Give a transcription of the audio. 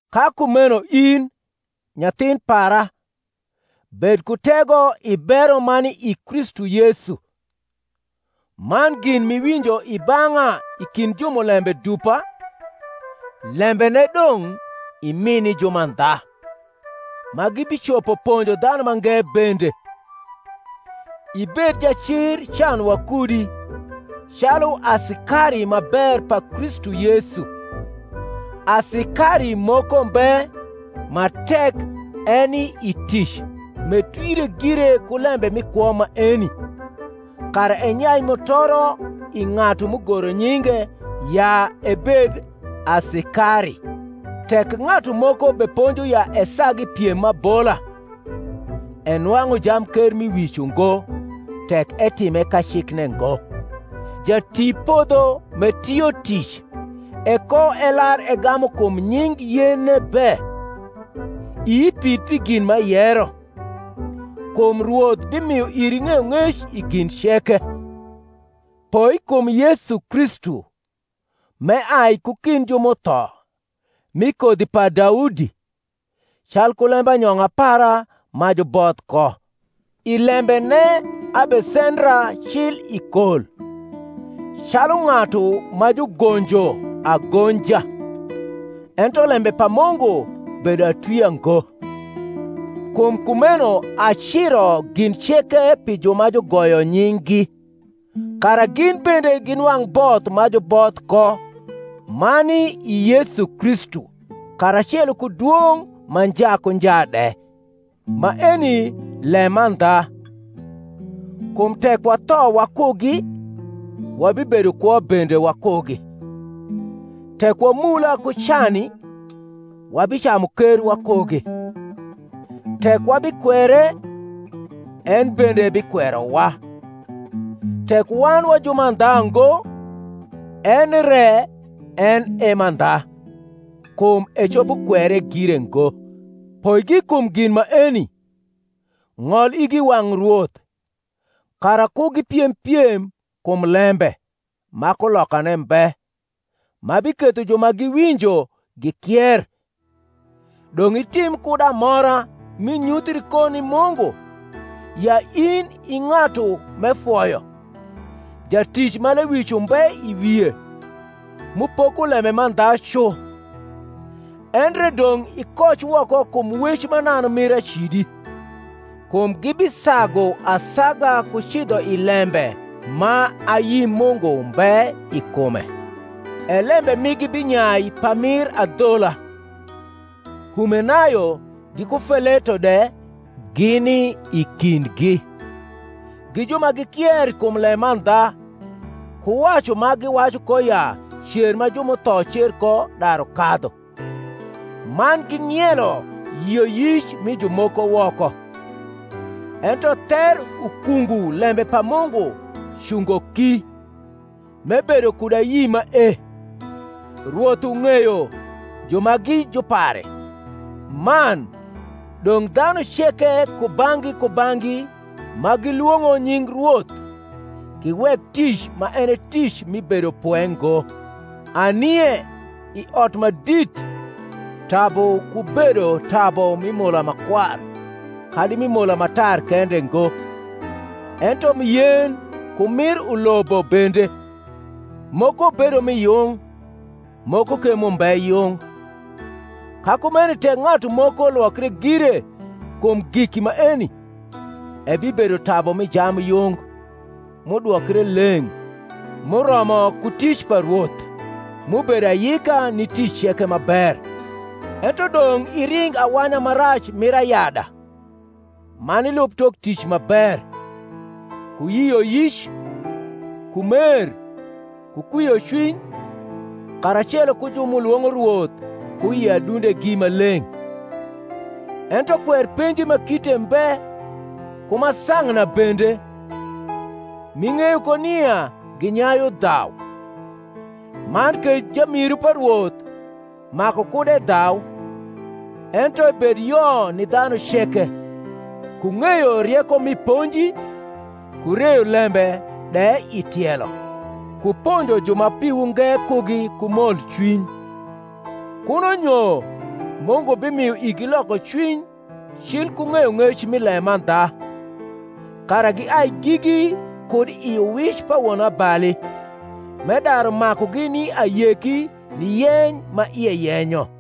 Ka kumeno in, nyathin para, bed ku tego i bero ma ni i Kristu Yesu. Man gin m’iwinjo i bang’a i kind jumulembe dupa, lembene dong’ imi ni jumandha, ma gibicopo ponjo dhanu mange bende. Ibed jacir can wakudi, calu asikari ma ber pa Kristu Yesu. Asikari moko mbe ma tek eni i tic m’etwire gire ku lembe mi kwo maeni; kara enyai mutoro i ng’atu m’ugoro nyinge ya ebed asikari. Tek ng’atu moko beponjo ya esag i piem m’abola, enwang’u jamkermiwic ungo, tek etime kacikne ngo. Jatipodho m’etio tic ekoelar egamu kum nying yenne be. Ii pid pi gin m’ayero; kum Rwoth bimio iri ng’eyong’ec i gin ceke. Poi kum Yesu Kristu, m’eai ku kind ju m’utho, mi kodhi pa Daudi, calku lembanyong’a para ma juboth ko: i lembene abesendra cil i kol, calu ng’atu ma jugonjo agonja; ento lembe pa Mungu bedo atwia ngo. Kum kumeno aciro gin ceke pi ju ma jugoyo nying’gi, kara gin bende ginwang’ both ma juboth ko ma ni i Yesu Kristu karacelo ku dwong’ ma nja ku nja de. Maeni lemandha: Kum tek watho wakugi, wabibedo kwo bende wakugi: tek wamula ku cani, wabicamu ker wakugi: tek wabikwere, en bende ebikwerowa: tek wan wa jumandha ngo, en re en e mandha; kum ecopo kwere gire ngo. Poigi kum gin maeni, ng’ol igi i wang’ Rwoth, kara ku gipiem piem kum lembe, ma kulokane mbe, ma biketho ju ma giwinjo gikier. Dong’ itim kud amora m’inyuthri ko ni Mungu, ya in i ng’atu m’efoyo, jatic ma lewic umbe i wie, m’upoko lembe mandha cu. Endre dong’ ikoc woko kum wec mananu mir acidi: kum gibisagu asaga ku cidho i lembe ma ayi Mungu mbe i kume, e lembe migi binyai pamir adhola: Humenayo giku Feleto de gini i kindgi; gi ju ma gikier kum lemandha, ku wacu ma giwacu ko ya cer ma ju m’utho cer ko daru kadhu, man ging’ielo yioyic mi jumoko woko. Ento ther ukungu lembe pa Mungu cungo ki, m’ebedo kud ayi mae, Rwoth uug’eyo ju ma gi jupare: man, dong’ dhanu ceke kubang’gi kubang’gi ma gilwong’o nying Rwoth giwek tic ma en e tic mi bedopwe ngo. Anie i ot ma dit tabu ku bedo tabu mi mola ma kwar kadi mi mola ma tar kende ngo, ento mi yen ku mir ulobo bende; moko bedo mi yung, moko ke m’umbe yung. Ka kumeno tek ng’atu moko lwokre gire kum giki maeni, ebibedo tabu mi jambyung, m’udwokre leng’, m’uromo ku tic pa Rwoth, m’ubedo ayika ni tic ceke ma ber. Ento dong’ iring awanya ma rac mir ayada, man ilub tok tic ma ber, ku yioyic, ku mer, ku kwiocwiny, karacelo ku ju m’ulwong’o Rwoth ku i adundegi ma leng’. Ento kwer penji ma kite mbe, ku ma sang’na bende, m’ing’eyo ko nia ginyayu dhau. Man ke jamiru pa Rwoth maku kud edhau, ento ebed yo ni dhanu ceke, ku ng’eyo rieko mi ponji, ku reyo lembe de i tielo, ku ponjo ju ma piwu nge kugi ku molcwiny; kuno nyo Mungu bimio igi lokocwiny cil ku ng’eyong’ec mi lemandha, kara giai gigi kud i uwic pa wonabali, m’edaru makugi ni ayeki ni yeny ma ie yenyo.